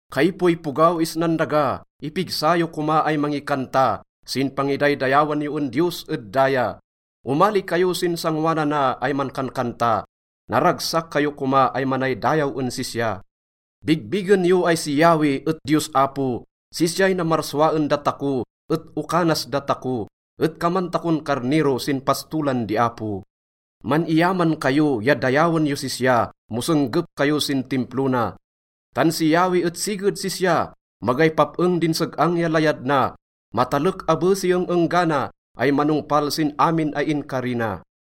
Kaipoipogaw isnan daga, ipigsa yo koma ay mangikanta sin pangidaydayawan yo en Diyos ed daya. Omali kayo sin sangoanana ay mankankanta, naragsak kayo koma ay manaydayaw en sisya. Bigbigen yo ay si Yahweh et Diyos Apo. Sisyay namarsua en datako et oka nas datako, et kaman takon karnero sin pastolan di Apo. Man-iyaman kayo ya dayawen yos sisya mo senggep kayo sin Timplo na. Tan si Yahweh et siged sisya. Magay pap-eng din seg-ang ya layad na. Matalek abe si eng-enggana ay manongpal sin amin ay inkari na.